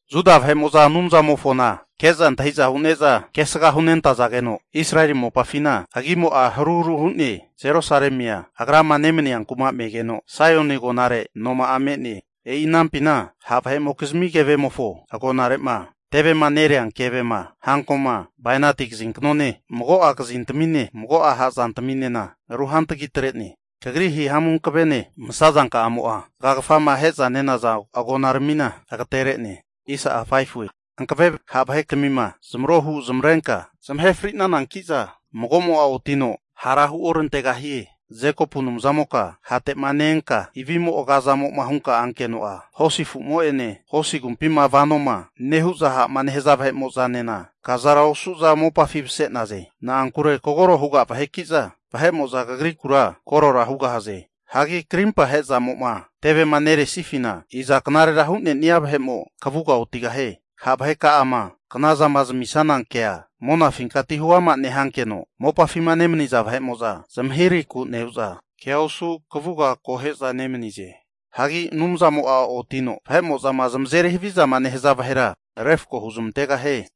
Juda vahe'mo'za Anumzamofona ke'za antahi'za hu'neza kesga hunentazageno, Israeli mopafina agimo'a haruharu hu'ne. Jerusalemia Agrama nemania kuma megeno, Saioni agonare noma'a me'ne. E'i anampina ha' vahe'mokizmi kevemofo agonare'ma tevema nerea kevema, hankoma, bainati kazinknone mago'a hazantamine ruhantagi atre'ne. Kagri hihamu hankavene masazanka'amo'a, zagagafama ahe'za nenaza agonaramina agatere'ne. Hankave ha' vahetmina zamarohu zamarenka zamahe fri'nanankiza mago'mo'a otino hara huorantegahie. Jekopu Anumzamoka hate'ma ne-enka ivimo agazamo'ma hunka ankeno'a, hosi afu'mo'ene hosi agumpima vanoma nehu'za ha'ma nehaza vahe'mo'zanena, kazara osu'za mopafi mase'naze. Na'ankure kagoro huga vaheki'za Kagrikura vahe'mo'za korora hugahaze. Hagi krimpa ahezamo'ma tevema neresifina, iza knarera hu'nenia vahe'mo kavuga otigahie? Ha' vaheka'ama knazama zamisana kea monafinkati huama nehankeno, mopafima nemaniza vahe'mo'za zmahirahiku nehu'za, kea osu kavuga akohe'za nemanize. Hagi Anumzamo'a otino vahe'mo'zama zamazeri havizama nehaza vahera refko huzmantegahie.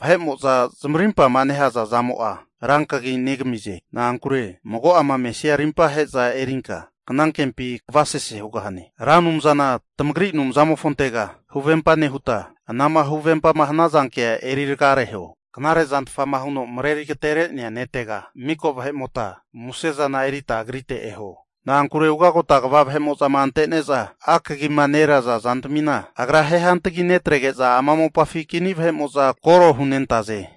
Vahe'mo'za zamarimpama nehaza zamo'a, rankagi negamize. Na'ankure mago'ama mesia rimpahe'za erinka kanankempi kavasese hugahane. Ra Anumzana tamagri Anumzamofontega huvempa nehuta, anama huvempama hanaza kea eri ragareho. Knare'zantfama huno mareri agatere'nea ne'tega miko vahe'mota musezana erita agrite eho! Na'ankure ugagota kva vahe'mo'zama antene'za, akagima neraza zantamina, Agra ahe hantagi netrege'za, ama mopafi kini vahe'mo'za koro hunentaze.